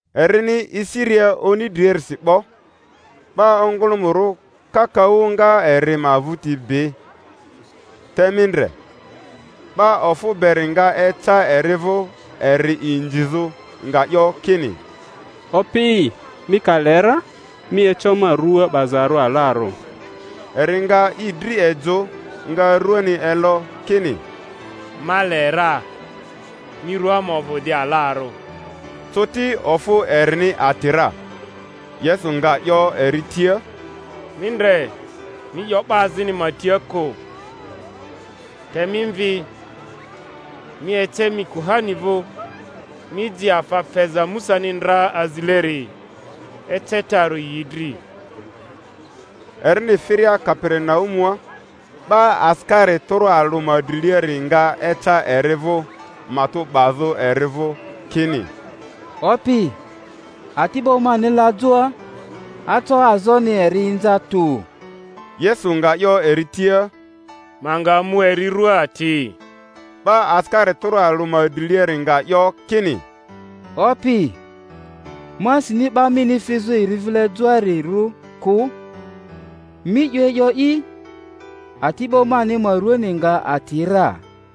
Erini esiria oni driarisi 'bo, 'ba ongᴜlᴜmᴜrᴜ kakaᴜ nga eri ma vᴜti bi. Te mi ndre, 'ba ofᴜ beri nga eca eri vᴜ eri inzizᴜ, nga 'yo kini, Opi, mi ka le ra, mi eco ma rua 'bazarᴜ alarᴜ. Eri nga i dri ejᴜ, nga ruani elo, kini, Ma le ra; mi rua ma ovᴜ di alarᴜ. Coti ofᴜ erini ati ra. Yesu nga 'yo eri tia, Mi ndre mi 'yo 'ba azini ma tia kᴜ; te mi mvi, mi ece mi kuhani vᴜ, mi ji afa feza Musani ndra azileri, ecetarᴜ yi dri. Erini firia Kaperinaumua, 'ba asikari tᴜrᴜ alᴜ ma driliari nga eca eri vᴜ, matᴜ 'bazᴜ eri vᴜ kini, Opi, ati'bo mani la joa, aco azoni eri inza tᴜ. Yesu nga 'yo eri tia, Ma nga mu eri rua ati. 'Ba asikari tᴜrᴜ alᴜ ma driliari nga 'yo kini, Opi, ma sini 'ba mini fizᴜ eri vile joarirᴜ kᴜ; mi 'yo e'yo'i, ati'bo mani ma ruani nga ati ra.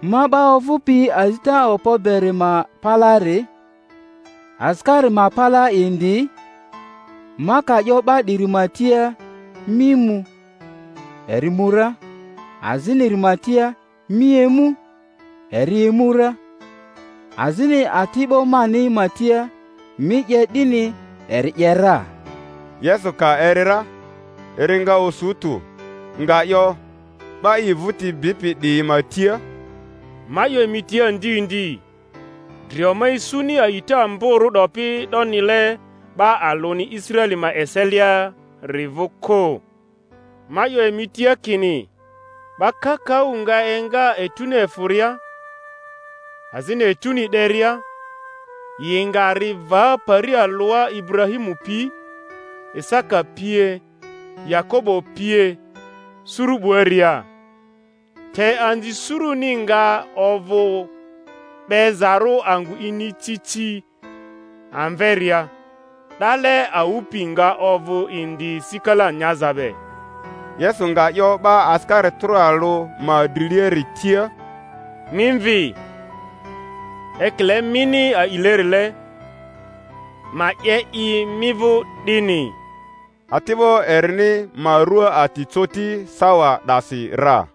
Ma 'ba ovᴜpi azita okpo beri ma palaari, asikari ma palaa indi; ma ka 'yo 'ba 'diri ma tia, Mi mu, eri mu ra; aziniri ma tia, Mi emu, eri emu ra; azini ati'bo mani ma tia, Mi 'ye 'dini, eri 'ye ra. Yesu ka eri ra, eri nga osu tᴜ, nga 'yo 'ba i vᴜti bipi 'diyi ma tia, Ma 'yo emi tia ndi ndi, drio ma isuni a'ita amborᴜ 'dopi 'donile 'ba alᴜni Israeli ma eseliari vᴜ kᴜ. Ma 'yo emi tia kini 'ba kakaᴜ nga enga etuni efᴜria, azini etuni 'deria, yi nga ri va pari alᴜa Iburahimu pi, Isaka pie, Yakobo pie, suru 'buaria, te anzi suruni nga ovᴜ 'bezarᴜ angᴜ inicici amveria; ‘dale awᴜ pi nga ovᴜ indi sikala nyaza be. Yesu nga 'yo 'ba asikari tᴜrᴜ alᴜ ma driliari tia, Mi mvi; ekile mini a'ilerile, ma 'ye i mi vᴜ 'dini. Ati'bo erini ma rua ati coti sawa 'dasi ra.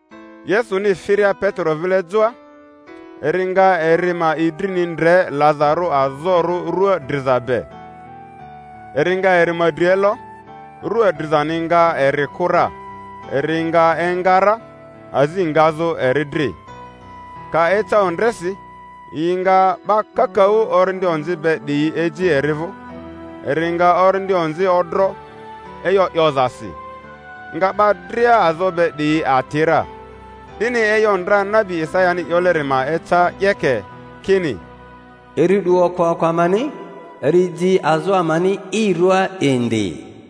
Yesuni firia Petero vile joa, eri nga eri ma idrini ndre lazarᴜ azorᴜ rᴜa driza be; eri nga eri ma dri elo, rua drizani nga eri kᴜ ra, eri nga enga ra, azi ngazᴜ eri dri. Ka eca ondresi yi nga 'ba kakaᴜ orindi onzi be 'diyi eji eri vᴜ; eri nga orindi onzi odro e'yo 'yozasi, nga 'ba dria azo be 'diyi ati ra. 'Dini e'yo ndra nabi Isayani 'yoleri ma eca 'yeke, kini, Eri 'du okpoako amani, eri ji azo amani i rᴜaa indi.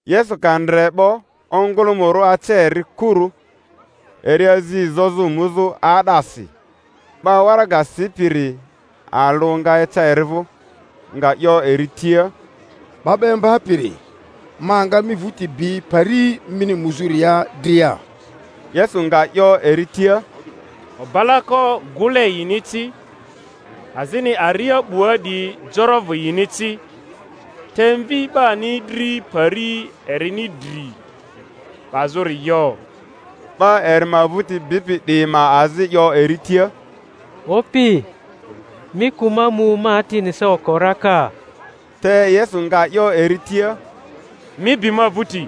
Yesu ka ndre 'bo ongᴜlᴜmᴜrᴜ ace eri kuru, eri azi zozᴜ muzᴜ 'aa'dasi. 'Ba waraga sipiri alᴜ nga eca eri vᴜ, nga 'yo eri tia, 'Ba 'ba Imbapiri, ma nga mi vᴜti bi pari mini muzᴜria dria. Yesu nga 'yo eri tia, Obalako gᴜle yini ci, azini aria 'bua 'diyi jorovᴜ yini ci; te Mvi 'bani dri pari ermi dri 'bazᴜri yo. 'Ba eri ma vᴜti bipi 'diyi ma azi 'yo eri tia, Opi, mi kᴜ ma mu ma atini sa oko raka. Te Yesu nga 'yo eri tia, Mi bi ma vᴜti,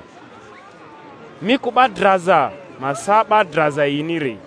mi kᴜ 'ba draza ma sa 'ba draza yiniri.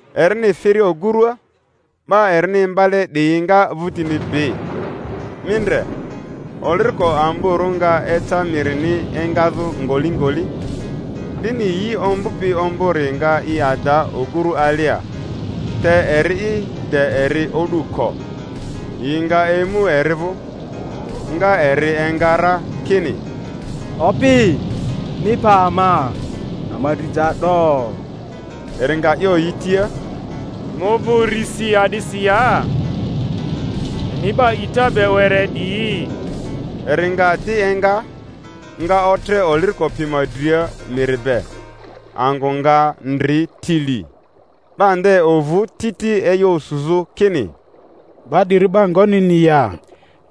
Erini firia ogurua, 'ba erini imbale 'diyi nga vᴜtini bi. Mi ndre, oliriko amborᴜ nga eca mirini engazᴜ ngolingoli, 'dini yi ombᴜpi ombᴜri nga i ada ogurᴜ alia; te eri'i, de eri o'du ko. Yi nga emu eri vᴜ, nga eri enga ra, kini, Opi, mi pa ama; ama dri ja 'do! Eri nga 'yo yi tia, Emi ovᴜ urisi a'disi ya, emi 'ba a'ita be were 'diyi? Eri nga di enga, nga otre oliriko pi ma dria miri be; angᴜ nga ndri tili. 'Ba nde ovᴜ titi e'yo osuzᴜ, kini, 'Ba 'diri 'ba ngonini ya,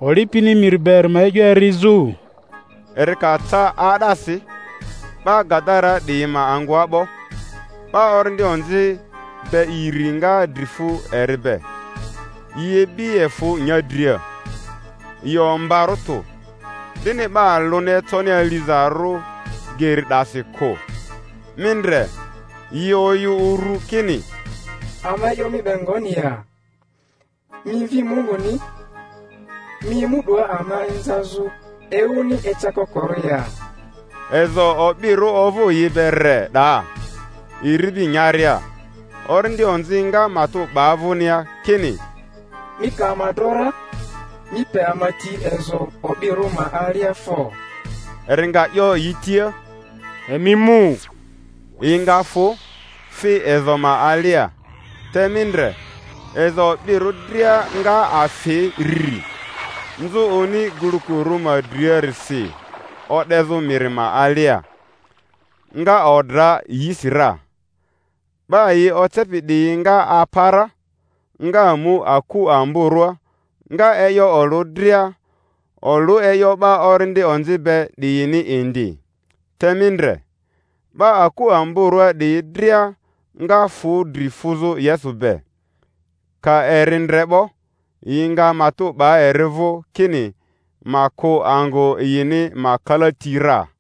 oli pini miri be eri ma e'yo erizᴜ? Eri ka ca 'aa'dasi, 'ba Gadaraa 'diyi ma angᴜa 'bo, 'ba orindi onzi be iri nga dri fu eri be; yi ibi efᴜ nyadria, yi ombarᴜ tᴜ, 'dini 'ba alᴜni econi alizarᴜ geri 'dasi kᴜ. Mi ndre, yi oyᴜ uru kini, Ama e'yo mi be ngoni ya, mi Mvi Munguni? Mi emu 'doa ama inza zᴜ ewuni ecakokorᴜ ya? Ezo o'birᴜ ovᴜ yi be re 'daa, iribi nyaria. Orindi onzi nga matᴜ 'ba vᴜnia kini, Mi ka ama dro ra, mi pe ama ti ezo o'birᴜ ma alia fo! Eri nga 'yo yi tia, Emi mu. Yi nga fᴜ, fi ezo ma alia; te mi ndre, ezo o'birᴜ dria nga afi rri, nzᴜ oni gulukurᴜ ma driarisi o'dezᴜ miri ma alia, nga odra yisira. 'Ba yi ocepi 'diyi nga apa ra, nga mu aku amborᴜa, nga e'yo olᴜ dria, olᴜ e'yo 'ba orindi onzi be 'diyini indi. Te mi ndre, 'ba akᴜ amborᴜa 'diyi dria nga fᴜ dri fuzᴜ Yesu be; ka eri ndre 'bo, yi nga matᴜ 'ba eri vᴜ kini ma kᴜ angᴜ yini ma kalati ra.